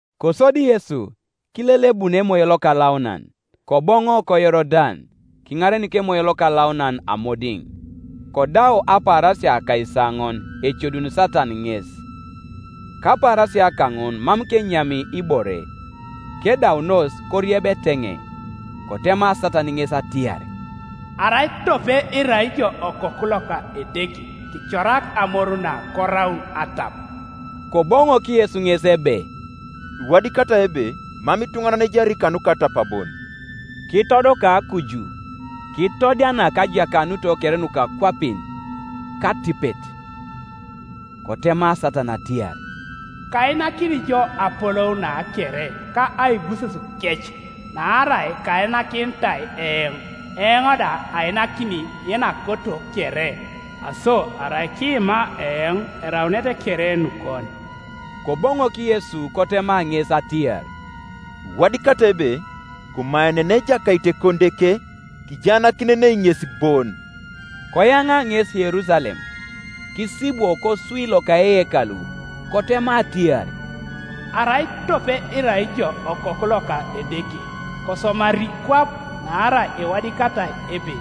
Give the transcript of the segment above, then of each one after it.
Kosodi Yesu, kilelebun Emoyo Lokalaunan, koboŋo koYorodan, kiŋarenik Emoyo Lokalaunan amodiŋ, kodau apaarasia akaisaoŋon, ecoduni Satan ŋes. Kapaarasia kaŋun mam kenyami ibore: kedaunos, korieb eteŋei, Kotema Satan ŋes atiar, “Arai tope irai ijo Okoku loka Edeke kicorak amoru na koraun atap.” Koboŋok Yesu ŋes ebe, “Iwadikatai ebe, Mam ituŋanan ejari kanuka atap bon.” Kitodoka kuju, kitodianak ajakanuto kere nuka akwapin, katipet, Kotema Satan atiar, “Kainakini jo apolou na kere, ka aibusesukec; naarai kainakinitai eoŋ; eoŋ da ainakini yenakoto kere. Aso arai kiima eoŋ, eraunete kere nukon.” Koboŋok Yesu kotema ŋes atiar, “Iwadikatai ebe, Komaenenei Ejakait Ekonideke, kijaanakinenei ŋes bon.” Koyaŋa ŋes Yerusalem, kisibwo koswi loka eyekalu, kotema atiar, “Arai tope irai ijo Okoku loka Edeke, kosomari kwap. Naarai iwadikatai ebe,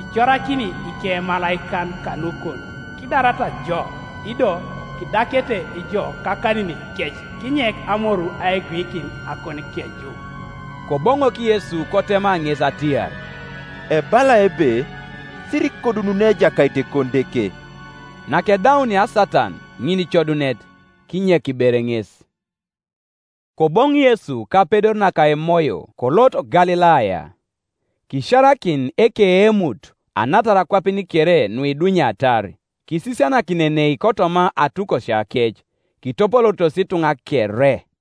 Icorakini ikemalaikan kanukon, kidarata jo. Ido, Kidakete jo kakaninikec, Kinyek amoru aiguikin akonikeju.” Koboŋok Yesu kotema ŋes atiar, “Ebalai ebe, Sirikodununei Ejakait Ekonideke.” Nakedaunia Satan ŋinicodunet, kinyek ber ŋes. Koboŋ Yesu kapedor naka Emoyo, kolot Galilaya: kisiarakin ekeemutu anatar akwapin kere nuidunyatar. Kisisianakinenei kotoma atukosiakec, kitopolooritos ituŋa kere.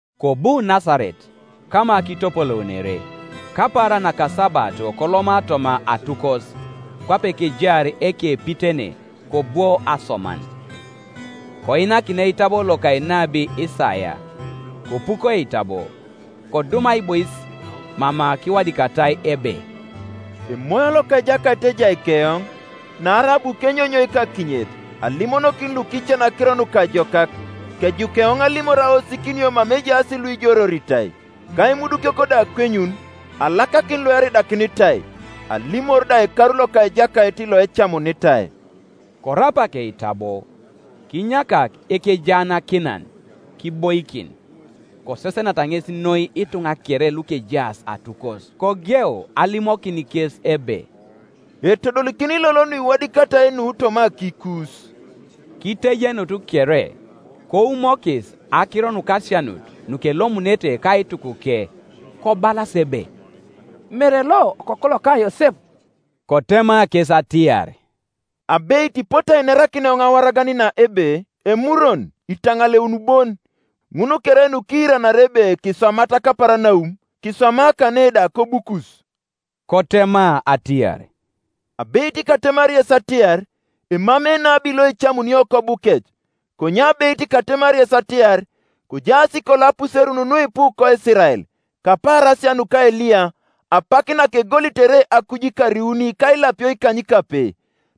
Kobu Nasaret, kama kitopolounere; kapaaran nakasabato koloma toma atukos, kwape kejaar ekepitene, kobwo asoman. Koinakinai eitabo loka enabi Isaia. Kopuko eitabo, kodum aibois mama kiwadikatai ebe, “Emoyo loka Ejakait ejai keoŋ, Naarai abu kenyonyoik akinyet alimonokin lukican akiro nukajokak; Kejuk eoŋ alimor aosikinio mama ejaas luijoreoritai, Ka imudukiok da akwenyun, Alakakin lueridakinitai. Alimor da ekaru loka Ejakait loecamunitai.” Korapak eitabo, kinyakak ekejaanakinan, kiboikin; kosesenata ŋes noi ituŋa kere lukejaas atukos. Kogeu alimokin kes ebe, “Etodolikin lolo nukiwadikatai nu toma akiikus.” Kitejenut kere, koumokis akiro nukasianut nukelomunete kaitukuke: kobalas ebe, “Mere lo okoku loka Yosep?” Kotema kes atiar, “Abeit ipote ainerakin eoŋ awaragan na ebe, ‘Emurwon, kitaŋaleun bon: ŋun kere nukiiranari ebe kiswamat Kaparanaum, kiswama kane da kobukus.’” Kotema atiar, “Abeit katemari yes atiar, Emamei enabi loecamunio kobukec. Konye abeit katemari yes atiar, Kojaas kolo apuserun nuipu koIsirael kapaarasia nuka Eliya, apak nakegolitere akuj ikar iuni ka ilapio ikanykape,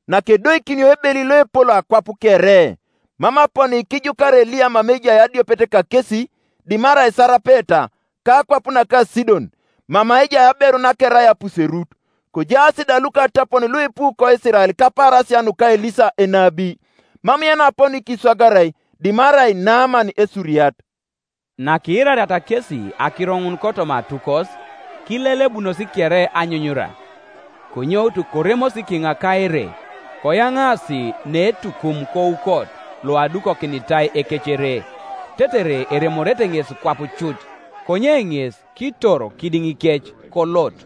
nakedoikinio ebeli loepol akwap kere; mam aponi kijukarai Eliya mama ejai adiopet kakesi, dimarai Sarapeta, kakwap naka Sidon, mama ejai aberu nakerai apuserut. Kojaas da lukatapon luipu koIsirael kapaarasia nuka Elisa enabi; mam yenaponi kiswagarai, dimarai Naaman Esuriat.” Nakiirariata kesi akiro ŋun kotoma atukos, kilelebunos kere anyunyura. Konyoutu, koremosi kiŋa ka ere, koyaŋaasi neetukum koukot loadukokinitai ekecere, tetere eremorete ŋes kwap cut. Konye ŋes kitoro kidiŋikec kolot.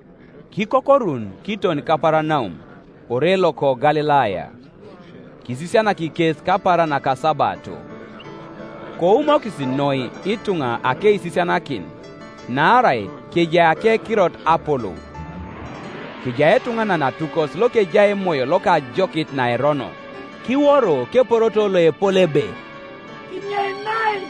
Kikokorun kiton Kaparanaum, ore loko Galilaya. Kisisianak kes kapaaran nakasabato, Koumokis noi ituŋa akeisisianakin; naarai kejai akekirot apolou, Kejai etuŋanan atukos lokejai emoyo loka ajokit naerono, kiworo keporoto loepol ebe, “Kinyeinai!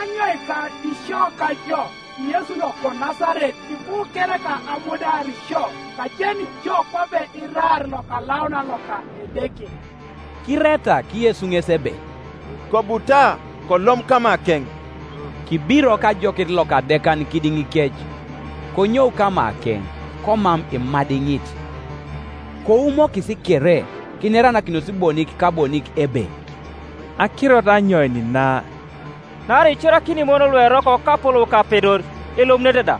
Anyoika isio kajo, Yesu loko Nasaret? Ibu kereka amudiar sio? Kajeni jo kwape iraar, Lokalaunan loka Edeke.” Kiretak Yesu ŋes ebe, “Kobuta, kolom kamakeŋ.” Kibirok ajokit lokadekan kidiŋikec, konyou kamakeŋ, komam imadiŋit, Koumokis kere, kineranakinos bonik ka bonik ebe, “Akirot anyoin na? Naarai icorakini imoyon lueroko kapolou ka apedor, elomunete da.”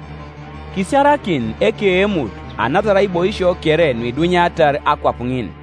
Kisiarakin ekeemut anatar aiboisio kere nuidunyatar akwap ŋin.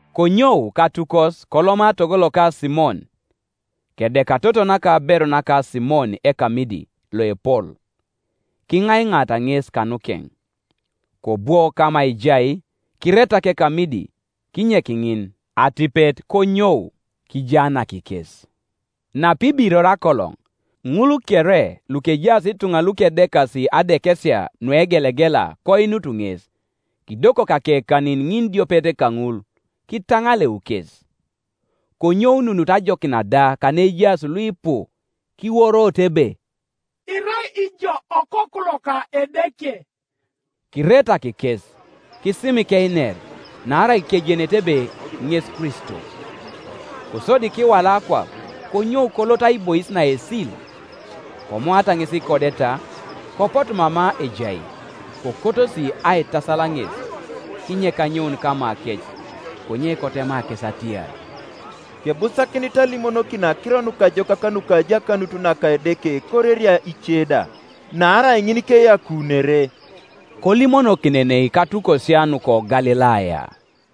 Konyou katukos koloma togo loka Simon. Kedeka toto naka aberu naka Simon ekamidi loepol; kiŋaiŋaata ŋes kanukeŋ. Kobwo kama ejai, kiretak ekamidi; kinyek ŋin: atipet konyou kijaanak kes. Napibiror akoloŋ, ŋul kere lukejaas ituŋa lukedekasi adekesia nuegelegela koinut ŋes; kidokok akekanin ŋinidiopet kaŋul, kitaŋaleu kes. Konyoununut ajokin da kaneejaas luipu, kiworoto ebe, “Irai ijo Okoku loka Edeke.” Kiretak kes, kisimik einer, naarai kejenete ebe ŋes Kristo. Kosodi kiwala akwap, konyou kolot aibois naesil; komoata ŋes ikodeta, kopotu mama ejai, kokotosi aitasal ŋes, kinyek anyoun kamakec. Konye kotema kes atiar, “Kebusakinit alimonokin akiro nukajokak nuka ajakanut naka Edeke koreria ice da: naarai ŋin keyakuunere.” Kolimonokinenei katukosia nuko Galilaya.